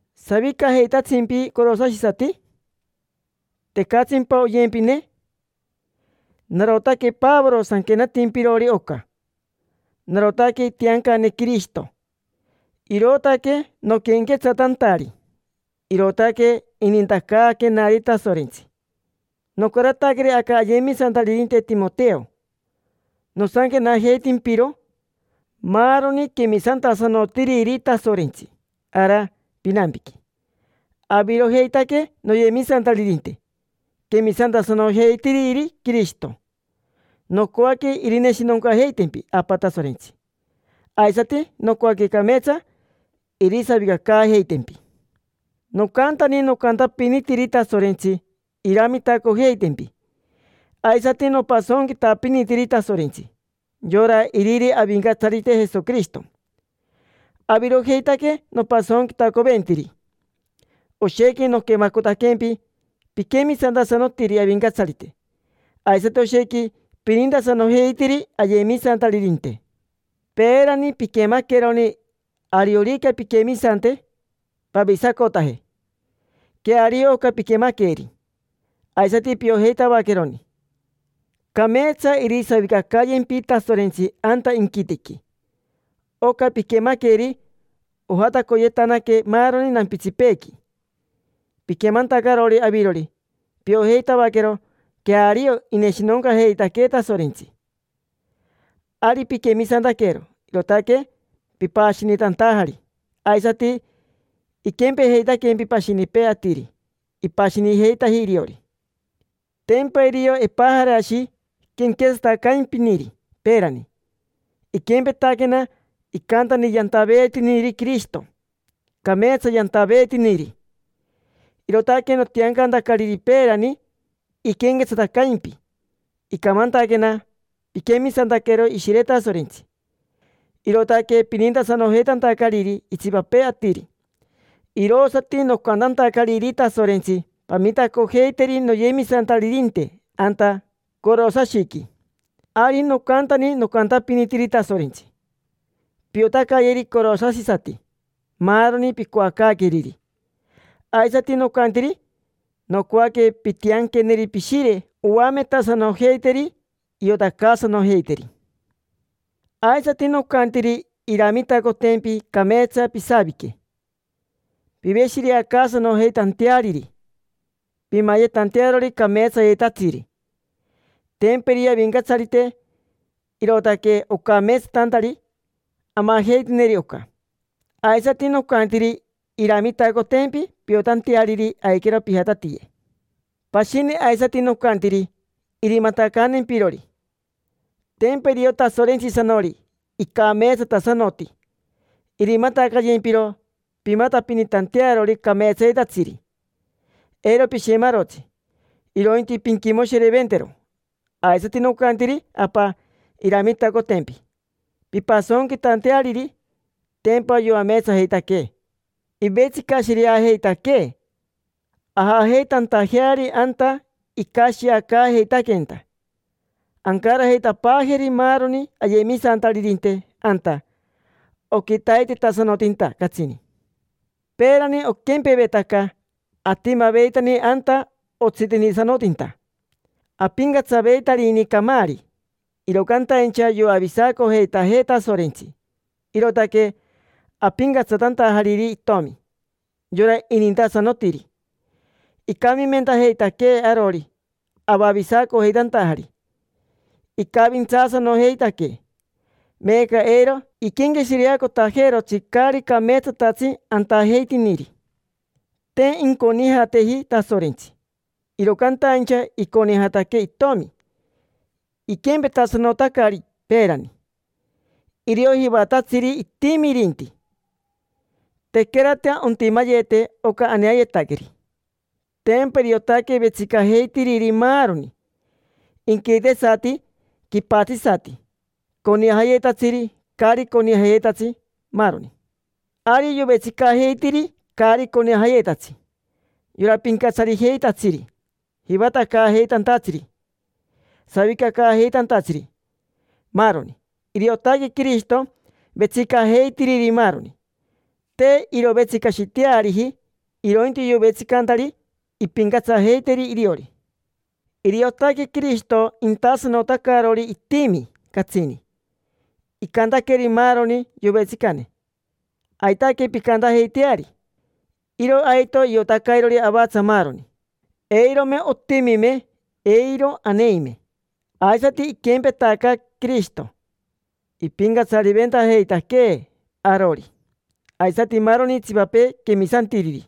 ¿Savicajeitatsimpi, corosashisati? ¿Tecatsimpa oyempine? Narotaque Pavoro sanquenatimpirori oca. Narotaque itiancane Quirishito, irootaque noquenquetsatantari: irootaque inintacaaquenari Tasorentsi. Nocarataqueri aca ayemisantaririnte Timoteo. Nosanquenajeitimpiro maaroni quemisantasanotiriri Tasorentsi ara pinampiqui: avirojeitaque noyemisantaririnte quemisantasanojeitiriri Quirishito. Nocoaque irineshinoncajeitempi Apa Tasorentsi, aisati nocoaque cameetsa irisavicacaajeitempi. Nocantani nocantapinitiri Tasorentsi iramitacojeitempi, aisati nopasonquitapinitiri Tasorentsi: yora iriri Avincatsarite Jesoquirishito. Avirojeitaque nopasonquitacoventiri. Oshequi noquemacotaquempi, piquemisantasanotiri Avincatsarite, aisati oshequi pinintasanojeitiri ayemisantaririnte. Peerani piquemaqueroni ariorica pinquemisante, pavisacotaje. Queario oca piquemaqueri. Aisati piojeitavaqueroni cameetsa irisavicacayempi Tasorentsi anta inquitequi. Oca piquemaqueri ojatacoyetanaque maaroni nampitsipeequi. Piquemantacarori avirori, piojeitavaquero queario ineshinoncajeitaquee Tasorentsi. Ari piquemisantaquero, irootaque pipashinitantajari. Aisati iquempejeitaquempi pashinipee atiri, ipashinijeitaji iriori. Tempa irio Epajarashi quenquetsatacaimpiniri peerani. Iquempetaquena, icantani yantaveetiniri Quirishito. Cameetsa yantaveetiniri, irootaque notiancantacariri peerani iquenquetsatacaimpi. Icamantaquena piquemisantaquero Ishire Tasorentsi, irootaque pinintasanojeitantacariri itsipapee atiri, irosati nocantantacariri Tasorentsi: “Pamitacojeiteri noyemisantaririnte anta Corosashiqui”. Ari nocantani nocantapinitiri Tasorentsi: “Piotacayeri corosashisati maaroni picoacaaqueriri”. Aisati nocantiri: “Nocoaque pintianqueneri Pishire oametasanojeiteri, iotacaasanojeiteri”. Aisati nocantiri iramitacotempi cameetsa pisavique, piveshireacaasanojeitanteariri, pimayetantearori cameetsayetatsiri. Tempa irio Avincatsarite, irootaque ocameetsatantari amajeiteneri oca. Aisati nocantiri iramitacotempi piotanteariri, aiquero pijatatiye. Pashini aisati nocantiri irimatacantempirori: tempa irio Tasorentsisanori, icameetsatasanoti. Irimatacayempiro pimatapinitantearori cameetsayetatsiri: eiro pishemarotsi, irointi pinquimoshireventero. Aisati nocantiri Apa iramitacotempi pimpasonquitanteariri. Tempa yoameetsajeitaquee, ivetsicashireajeitaquee ajajeitantajeari anta icashiacaajeitaqueenta. Ancarajeitapaajeri maaroni ayemisantaririnte anta oquitaitetasanotinta catsini. Peerani oquempevetaca atimaveitani anta otsitenitasanotinta: apincatsaveitarini camaari. Iro cantaincha yoavisacojeitajee Tasorentsi, irootaque apincatsatantajariri Itomi: yora inintasanotiri. Icamimentajeitaquee arori, avavisacojeitantajari. Icavintsaasanojeitaquee, meeca eiro iquenqueshireacotajeerotsi caari cameetsatatsi antajeitiniri. Te inconijateji Tasorentsi, iro cantaincha iconijataque itomi, iquempetasanotacari. Peerani, irio jivatatsiri itimi irinti, tequerata ontimayete oca aneayetaqueri. Tempa iriotaque vetsicajeitiriri maaroni: inquitesati, quipatsisati, conijayetatsiri, caari conijayetatsi, maaroni. Ari yovetsicajeitiri caari conijayetatsi: yora pincatsarijeitatsiri, jivatacaajeitantatsiri, savicacaajeitantatsiri, maaroni. Iriotaque Quirishito vetsicajeitiriri maaroni. Te irovetsicashiteariji, irointi yovetsicantari impincatsajeiteri iriori. Iriotaque Quirishito intasanotacarori itimi, catsini. Icantaqueri maaroni yovetsicane: “Aitaque pincantajeiteari”. Iro aito iotacairori avatsa maaroni. Eirome otimime, eiro aneime. Aisati iquempetaca Quirishito: ipincatsariventajeitaquee arori, aisati maaroni itsipapee quemisantiriri;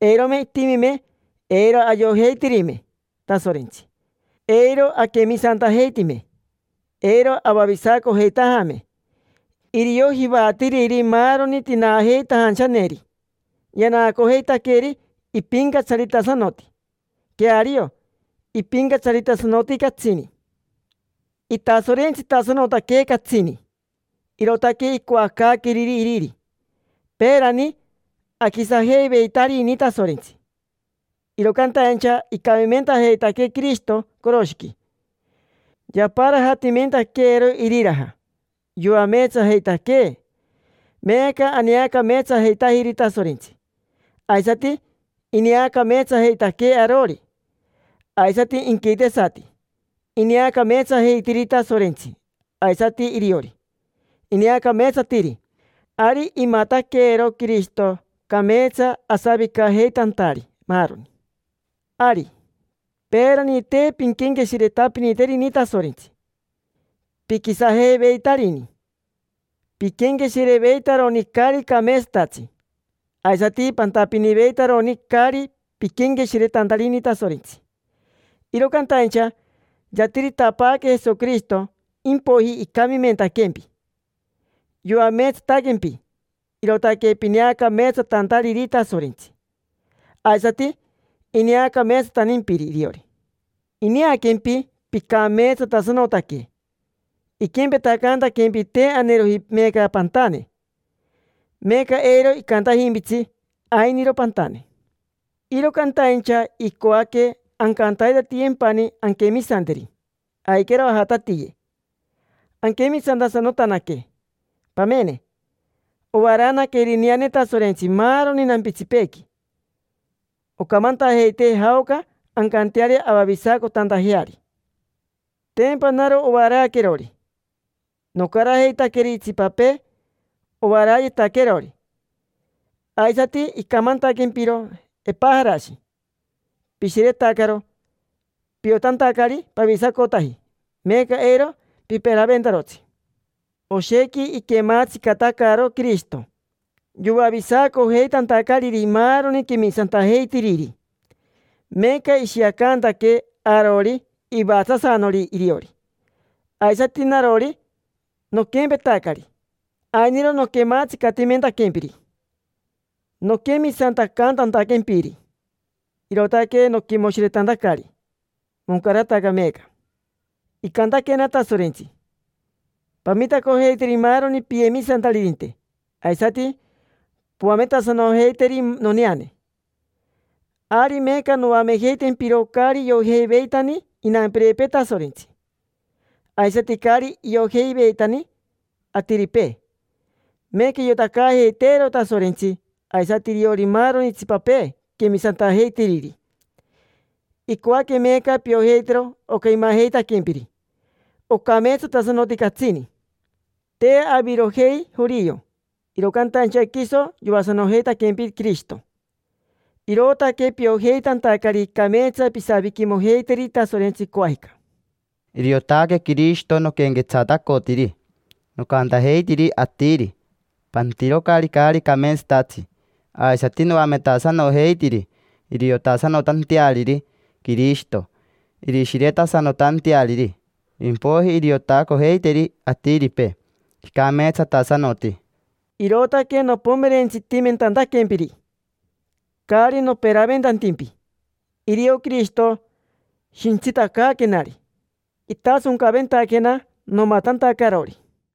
eirome itimime, eiro ayojeitirime Tasorentsi, eiro aquemisantajeitime, eiro avavisacojeitajame. Irio jivatiriri maaroni tinaajeitajanchaneri, yanaacojeitaqueri ipincatsaritasanoti. Queario ipincatsaritasanoti catsini, itasorentsitasanotaque catsini: irootaque icoacaaqueriri iriri. Peerani aquisajeiveitarini Tasorentsi, iro cantaincha icamimentajeitaquee Quirishito coroshiqui, yaparajatimentaqueero iriraja. Yoameetsajeitaquee, meeca aneacameetsajeitajiri Tasorentsi, aisati ineacameetsajeitaquee arori. Aisati inquitesati, ineacameetsajeitiri Tasorentsi; aisati iriori, ineacameetsatiri. Ari imataquero Quirishito, cameetsa asavicajeitantari maaroni. Ari, peerani te pinquenqueshiretapiniterini Tasorentsi, piquisajeiveitarini. Piquenqueshireveitaroni caari cameetsatatsi, aisati pantapiniveitaroni, caari piquenqueshiretantarini Tasorentsi. Iro cantaincha yatiritapaaque Jesoquirishito, impoiji icamimentaquempi, yoameetsataquempi, irootaque pineacameetsatantariri Tasorentsi, aisati ineacameetsatantimpiri iriori. Ineaquempi picameetsatasanotaque, iquempetacaantaquempi te aneajeroji meeca pantane. Meeca eiro icantajimpitsi: “Ainiro pantane”. Iro cantaincha icoaque ancantaitatiyempani anquemisanteri. Aiquero ajatatiye, anquemisantasanotanaque. Pamene, ovaraanaca irineane Tasorentsi maaroni nampitsipeequi. Ocamantajeitee jaoca ancanteari avavisacotantajeari. Tempa naro ovaraaquerori, nocarajeitaqueri itsipapee ovaraayetaquerori; aisati icamantaquempiro Epajarashi. Pishiretacaro, piotantacari pavisacotaji. Meeca eiro piperaventarotsi. Oshequi iquematsicatacaro Quirishito yoavisacojeitantacariri maaroni quemisantajeitiriri, meeca ishiacantaquee arori ivatsasanori iriori. Aisati narori, noquempetacari: ainiro noquematsicatimentaquempiri, noquemisantacantantaquempiri, irootaque noquimoshiretantacari. Moncarataca meeca. Icantaquena Tasorentsi: “Pamitacojeiteri maaroni piyemisantaririnte, aisati poametasanojeiteri noneane”. Ari meeca noamejeitempiro caari iojeiveitani inampirepee Tasorentsi, aisati caari iojeiveitani atiripee. Meeca iotacaajeiteero Tasorentsi, aisati iriori maaroni itsipapee quemisantajeitiriri. Icoaque meeca piojeitero oca imajeitaquempiri: ocameetsatasanoti catsini. Te avirojei jorio, iro cantaincha quiso yoasanojeitaquempi Quirishito, irootaque piojeitantacari cameetsa pisaviquimojeiteri Tasorentsi, coajica. Iriotaque Quirishito noquenquetsatacotiri. Nocantajeitiri atiri: “Pantirocari caari cameetsatatsi”. Aisati noametasanojeitiri iriotasanotanteariri Quirishito, irishiretasanotanteariri. Impoiji iriotacojeiteri atiripee, icameetsatasanoti. Irootaque nopomerentsitimentantaquempiri, caari noperaventantimpi. Irio Quirishito shintsitacaaquenari, itasoncaventaquena nomatantacarori.